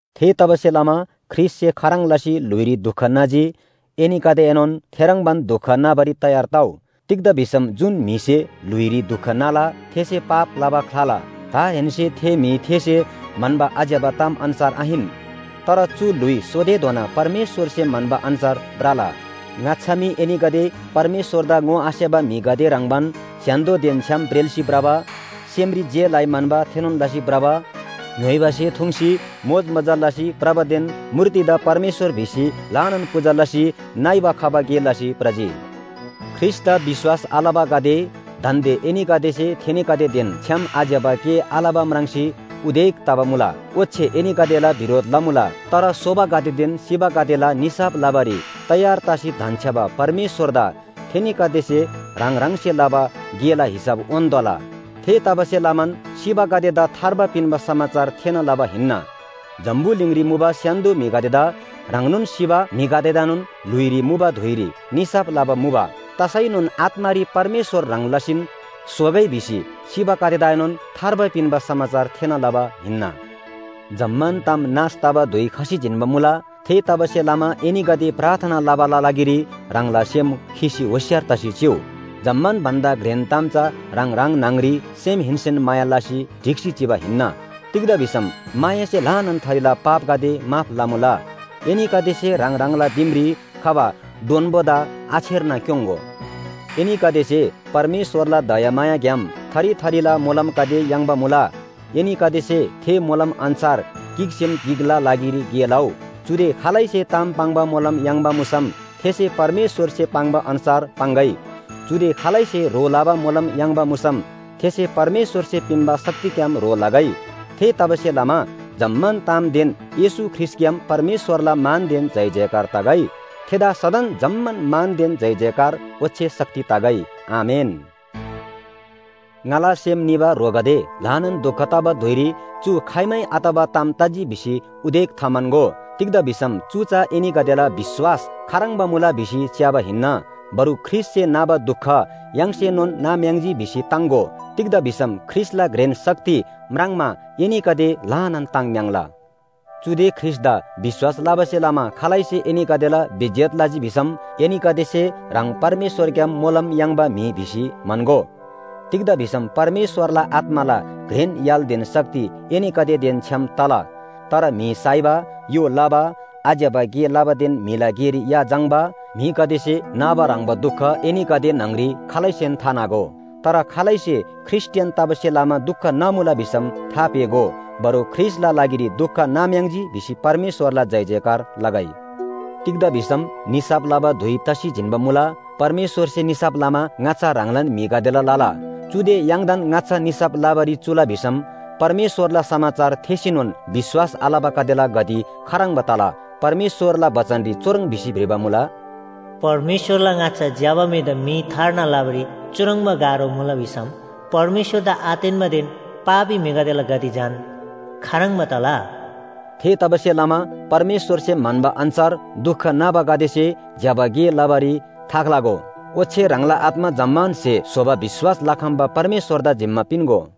थेतबासेलमा ख्रीष्‍टसे खाह्रङ् लसी ल्‍हुइरी दुख नाजी एनीगदेएनोन थेह्रङ्बान दुख नाबारी तयार तउ। तिग्‍दा भिसम जुन म्‍हिसे ल्‍हुइरी दुख नाला थेसे पाप लबा ख्‍लाला। दाहेन्‍से थे म्‍हि थेसे म्‍हन्‍बा आज्‍यबा ताम अन्‍छार आहिन, तर चु ल्‍हुइ सोतेधोना परमेश्‍वरसे म्‍हन्‍बा अन्‍छार भ्रला। ङाच्‍छा मी एनीगदे परमेश्‍वरदा ङोआसेबा म्‍हिगदे ह्रङ्‌बान स्‍य्‍हान्‍दोदेन छ्‌याम ब्रेल्‍सी भ्रबा, सेमरी जे लइ म्‍हन्‍बा थेनोन लसी भ्रबा, ङ्‌य्‍होइबा स्‍हे थुङ्सी मोजमजा लसी भ्रबादेन मूर्तिदा परमेश्‍वर भिसी ल्‍हानान पूजा लसी नइबा खबा गे लसी भ्रजी। ख्रीष्‍टदा विश्‍वास आलबागदे दान्‍दे एनीगदेसे थेनीगदेदेन छ्‌याम आज्‍यबा गे आलबा म्राङ्सी उदेक तबा मुला। ओच्‍छे एनीगदेला बिरोध लमुला। तर सोबागदेदेन सिबागदेला निसाफ लबारी तयार तसी धन्‍छ्‌याबा परमेश्‍वरदा थेनीगदेसे ह्राङ ह्राङसे लबा गेला हिसाब उन्‍तोःला। थेतबासेलमान सिबागदेदा थार्बा पिन्‍बा समाचार थेःना लबा हिन्‍ना। जम्‍बुलिङरी मुबा स्‍य्‍हान्‍दो म्‍हिगदेदा ह्रङ्नोन सिबा म्‍हिगदेदाएनोन ल्‍हुइरी मुबा धुइरी निसाफ लबा मुबा। तसैनोन आत्‍मारी परमेश्‍वर ह्रङ् लसीन सोगै भिसी सिबागदेदाएनोन थार्बा पिन्‍बा समाचार थेःना लबा हिन्‍ना। जम्‍मान ताम नाश तबा धुइ खसी जिन्‍बा मुला। थेतबासेलमा एनीगदे प्रार्थना लबाला लागिरी ह्राङला सेम खीसी होशियार तसी चिउ। जम्‍मान भन्‍दा घ्रेन ताम चा ह्राङ ह्राङ न्‍हङरी सेमहेन्‍सेन माया लसी ढिक्‍सी चिबा हिन्‍ना। तिग्‍दा भिसम मायासे ल्‍हानान थरीला पापगदे माफ लमुला। एनीगदेसे ह्राङ ह्राङला दिमरी खबा डोन्‍बोदा आछेर्ना क्‍योङ्‍गो। एनीगदेसे परमेश्‍वरला दयामायाग्‍याम थरी थरीला मोलमगदे याङ्बा मुला। एनीगदेसे थे मोलम अन्‍छार गिकसेम गिकला लागिरी गे लउ। चुदे खालैसे ताम पाङ्बा मोलम याङ्बा मुसम थेसे परमेश्‍वरसे पाङ्बा अन्‍छार पाङ्‌गै, चुदे खालैसे ह्रो लबा मोलम याङ्बा मुसम थेसे परमेश्‍वरसे पिन्‍बा शक्तिग्‍याम ह्रो लगै। थेतबासेलमा जम्‍मान तामदेन येशू ख्रीष्‍टग्‍याम परमेश्‍वरला मानदेन जयजयकार तगै। थेदा सदन जम्‍मान मानदेन जयजयकार ओच्‍छे शक्ति तगै। आमेन। ङाला सेम निबा ह्रोगदे, ल्‍हानान दुख तबा धुइरी चु खाइमै आतबा ताम तजी भिसी उदेक थाम्‍हन्‍गो। तिग्‍दा भिसम चु चा एनीगदेला विश्‍वास खाह्रङ्बा मुला भिसी च्‍याबा हिन्‍ना। बरु ख्रीष्‍टसे नाबा दुख य्‍हाङसेनोन नाम्‍याङ्जी भिसी ताङ्‍गो। तिग्‍दा भिसम ख्रीष्‍टला घ्रेन शक्ति म्राङ्मा एनीगदे ल्‍हानान ताङ्म्‍याङ्ला। चुदे ख्रीष्‍टदा विश्‍वास लबासे लमा खालैसे एनीगदेला बेइज्‍जत लजी भिसम एनीगदेसे ह्राङ परमेश्‍वरग्‍याम मोलम याङ्बा म्‍हि भिसी म्‍हन्‍गो। तिग्‍दा भिसम परमेश्‍वरला आत्‍माला घ्रेन य्‍हालदेन शक्ति एनीगदेदेन छ्‌याम तला। तर म्‍हि साइबा, य्‍हो लबा, आज्‍यबा गे लबादेन म्‍हिला गेरी या झाङ्‌बा म्‍हिगदेसे नाबा ह्रङ्‌बा दुख एनीगदे न्‍हङरी खालैसेन थानागो। तर खालैसे ख्रीष्‍टियान तबासे लमा दुख नामुला भिसम थापेःगो। बरु ख्रीष्‍टला लागिरी दुख नाम्‍याङ्जी भिसी परमेश्‍वरला जयजयकार लगै। तिग्‍दा भिसम निसाफ लबा धुइ तसी जिन्‍बा मुला, परमेश्‍वरसे निसाफ लमा ङाच्‍छा ह्राङलान म्‍हिगदेला लला। चुदे य्‍हाङदान ङाच्‍छा निसाफ लबारी चुला भिसम परमेश्‍वरला समाचार थेःसीनोन विश्‍वास आलबागदेला गति खाह्रङ्बा तला? परमेश्‍वरला बचनरी चुह्रङ् भिसी भ्रिबा मुला, “परमेश्‍वरला ङाच्‍छा ज्‍यबा म्‍हिदा मी थार्ना लबारी चुह्रङ्बा गाह्रो मुला भिसम परमेश्‍वरदा आतेन्‍बादेन पापी म्‍हिगदेला गति झन खाह्रङ्बा तला?” थेतबासेलमा परमेश्‍वरसे म्‍हन्‍बा अन्‍छार दुख नाबागदेसे ज्‍यबा गे लबारी थाख्‍लागो। ओच्‍छे ह्राङला आत्‍मा जम्‍मान स्‍हे स्‍होबा विश्‍वास लखम्‍बा परमेश्‍वरदा जिम्‍मा पिन्‍गो।